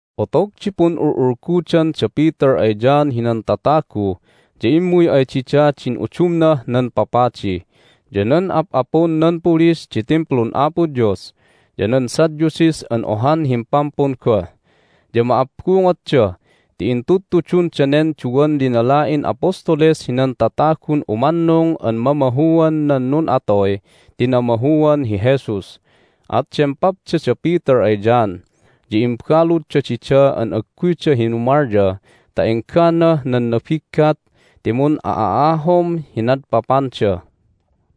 Otog di pun'ul'ulgudan da Peter ay John hinan tatagu ya immuy ay dida din udumnah nan papadi, ya nan ap'apun nan pulis di Timplun Apo Dios, ya nan Sadducees an ohan himpampun goh. Ya ma'abbungotda ti itudtudun danen duwan linala'in apostoles hinan tatagun umannung an mamahuan nan nun'atoy ti namahuan hi Jesus. At dempapda da Peter ay John, ya imbaludda dida an agguyda hinumalya ta engganah nan nabiggat ti mun'a'ahom hi nadpapanda.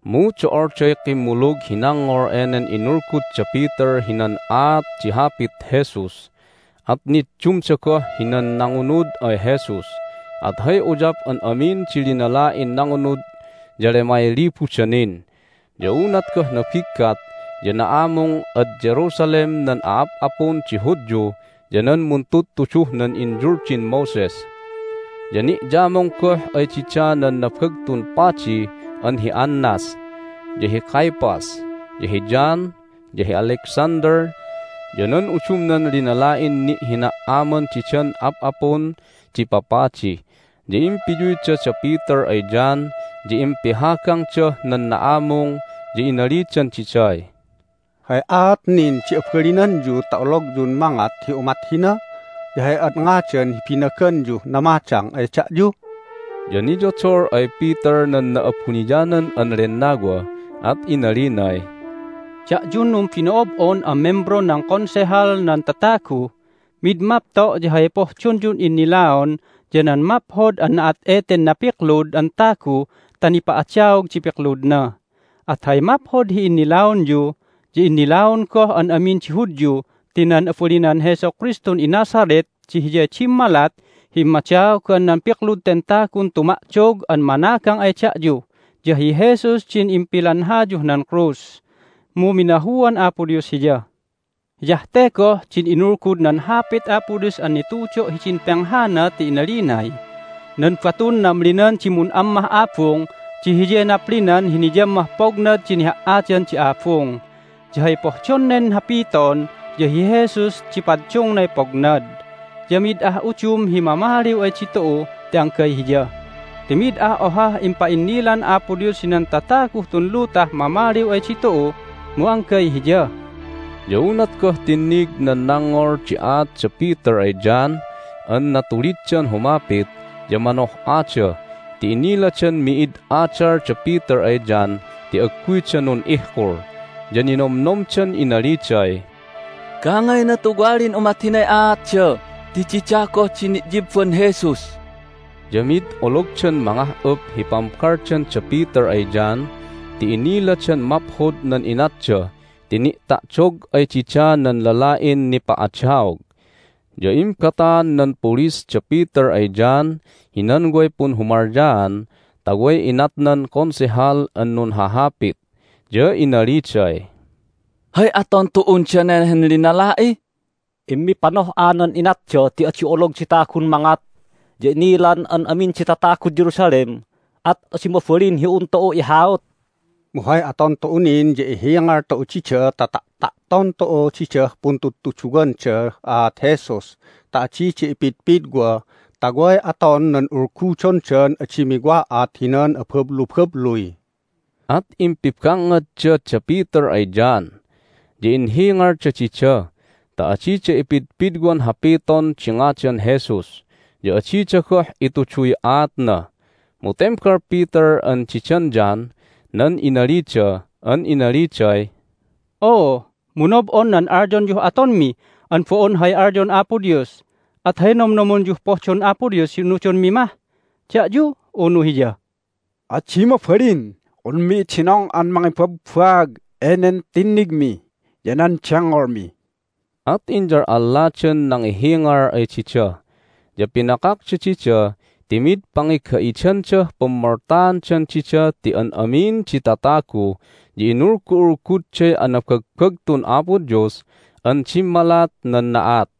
Mu do'olday kimmulug hi nangngol enen inulgud da Peter hinan aat di Hapit Jesus, at niddumda goh hinan nangunud ay Jesus, at hay uyap an amin di linala'in nangunud ya lemay libuda nin. Ya unat goh nabiggat ya na'amung ad Jerusalem nan a'ap'apun di Hudyu ya nan muntudtuduh nan inyuldin Moses. Ya ni'yamung goh ay dida nan Nabagtun Padi an hi Annas, ya hi Caiaphas, ya hi John, ya hi Alexander, ya nan udumnan linala'in ni'hina"aman didan ap'apun di papadi. Ya impiyuyda da Peter ay John, ya impihagangdah nan na'amung, ya inalidan diday, "Hay aat nin di abalinanyu ta ologyun mangat hi umat hina? Ya hay ad ngadan hi binaganyuh namadang ay da'yu?" Ya niyodol ay Peter nan Na'abuniyanan an Lennawa, at inalinay, "Da'yun numbino'ob'on an membron nan Konsehal nan tatagu! Mid mapto' ya hay pohdonyun innilaon ya nan maphod an na'at eten napiklud an tagu ta nipa'adaog di pikludna! At hay maphod hi innilaonyu ya innilaon goh an amin di Hudyu ti nan abalinan Jesu Kristun iNazareth di Hiyay dimmalat hi immadaogan nan piklud ten tagun tuma'dog an managang ay da'yu! Ya hi Jesus din impilanhayuh nan krus, mu minahuan Apo Dios Hiya. Hiyah te goh din inulgud nan Hapit Apo Dios an nitudo' hidin penghana ti inalinay, Nan batun namlinan di mun'ammah abung di hiyay naplinan hi niyammah pognad di niha"adan di abung. Ya hay pohdon nen hapiton ya hi Jesus di paddungnay pognad. Ya mid ah udum hi mamaliw ay ditu'u ti anggay Hiya, ti mid ah ohah impa'innilan Apo Dios hinan tataguh tun lutah mamaliw ay ditu'u, mu anggay Hiya!" Ya unat goh tinnig nan nangngol di aat da Peter ay John an natuliddan humapit ya manoh'ada ti inniladan mi'id adal da Peter ay John ti agguyda nun'ihkul, ya ninomnomdan inaliday, "Gangayna tuwalin umat hinay aatda ti dida goh di ni'yibban Jesus!" Ya mid ologdan mangah'up hi pambaldan da Peter ay John ti inniladan maphod nan inatda ti ni'ta'dog ay dida nan lala'in nipa'adaog. Ya imbataan nan pulis da Peter ay John hinan way punhumalyaan ta way inat nan Konsehal an nunhahapit. Ya inaliday, "Hay aton tu'un dane han linala'i? Immipanoh'a nan inatda ti adi olog di tagun mangat, ya inilan an amin di tatagud Jerusalem, at adi mabalin hi un tu'u ihaut! Mu hay aton tu'u nin ya ihingal tu'u dida ta ta'ta'ton tu'u didah puntudtuduwandah aat Jesus ta adida ipidpidwa, ta way aton nan ulgudondan adi miwa'at hinan abablubabluy." At impibangngadda da Peter ay John, ya inhingalda dida ta adida ipidpidwan hapiton di ngadan Jesus, ya adida goh ituduy aatna. Mu tembal Peter an didan John nan inalida an inaliday, "Oo, mu nob'on nan alyonyuh atonmi an bo'on hay alyon Apo Dios, at hay nomnomonyuh pohdon Apo Dios hi unudonmi mah---da'yu, unu Hiya? Adi mabalin unmi idinong an mangibabbaag enen tinnigmi ya nan dengngolmi!" At inyal'alladan nangihingal ay dida, ya pinakakda dida ti mid pangiga'idandah pummoltaandan dida ti an amin di tatagu ya inulgu'ulgudday anabagbagtun Apo Dios an dimmalat nan na'at.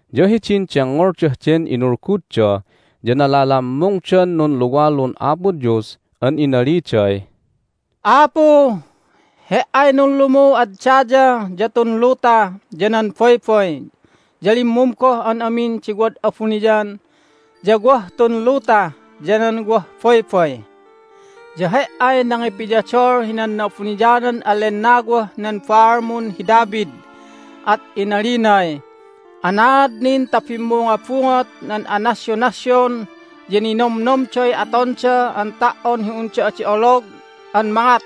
Ya hidin dengngoldah den inulgudda ya nalalammungdan nunluwalun Apo Dios an inaliday, "Apu, He"ay nunlumuh ad daya, ya tun luta, ya nan baybay, ya limmum goh an amin di wad abuniyan, ya wah tun luta, ya nan wah baybay. Ya He"ay nangipiyodol hinan Na'abuniyanan an Lennawah nan baalmun hi David, at inalinay, Anaad nin ta bimmungobungot nan anasyonasyon, ya ninomnomday atonda an ta"on hi unda adi olog an mangat?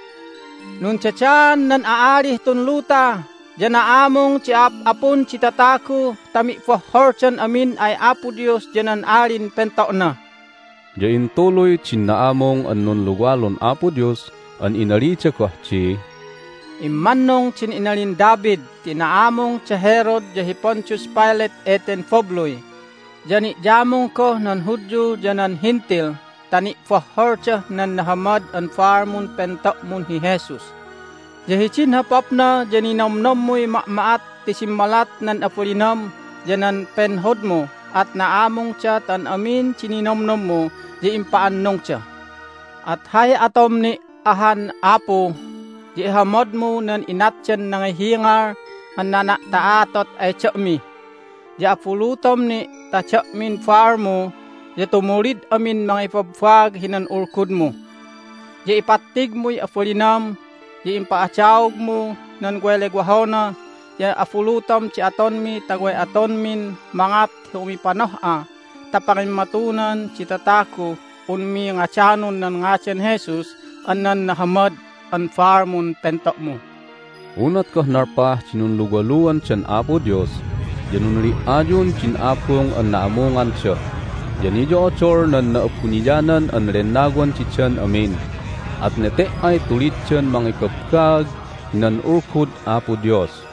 Nundadaan nan a'alih tun luta, ya na'amung di a'ap'apun di tatagu ta mi'bohholdan amin ay Apo Dios ya nan Alin Pento'na." Ya intuluy din na'amung an nunluwalun Apo Dios an inalida goh di, "Immannung din inalin David ti na'amung da Herod ya hi Pontius Pilate eten babluy, ya ni'yamung goh nan Hudyu ya nan Hentil ta ni'bohholdah nan nahamad an baalmun pento'mun hi Jesus. Ya hidin hopapna ya ninomnommuy ma'ma'at ti dimmalat nan abalinam ya nan penhodmu, at na'amungda ta an amin di ninomnommu ya impa'annungda. At hay atom ni' ahan, Apu, ya ihamadmu nan inatdan nangihingal an nana'ta'atot ay da'mi, ya abulutom ni' ta da'min baalmu ya tumulid amin mangibabbaag hinan Ulgudmu. Ya ipattigmuy abalinam, ya impa'adaogmu nan way lewohona, ya abulutom di atonmi ta way atonmin mangat hi umipanoh'a ta pangimmatunan di tataguh unmi ngadanon nan ngadan Jesus an nan nahamad an baalmun pento'mu." Unat goh nalpah di nunluwaluandan Apo Dios ya nunli"ayun din abung an na'amunganda. Ya niyo'odol nan Na'abuniyanan an Lennawan didan amin, at nete"ay tuliddan mangibabbaag hinan Ulgud Apo Dios.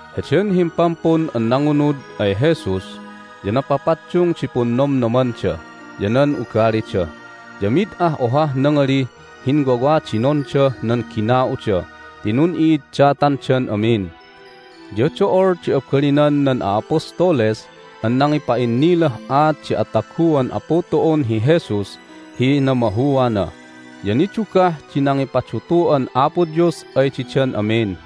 Heden himpampun an nangunud ay Jesus ya napapaddung di punnomnomanda ya nan ugalida. Ya mid ah ohah nangalih hinwawadinondah nan gina'uda ti nun'i'iddatandan amin. Ya do'ol di abalinan nan a'apostoles an nangipa'innilah aat di ataguan Apu tu'un hi Jesus hi namahuana, ya nidugah di nangipadutu'an Apo Dios ay didan amin.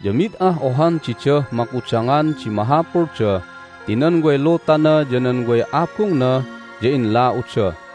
Ya mid ah ohan didah makudangan di mahapulda ti nan way lutana ya nan way abungna ya inla'uda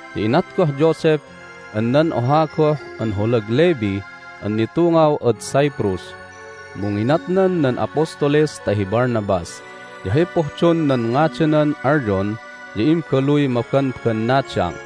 Ya inat goh Joseph an nan oha goh an holag Levi an nitungaw ad Cyprus, mu nginatnan nan apostoles ta hi Barnabas (ya hay pohdon nan ngadanan alyon ya Imbaluy Mabanbannadang)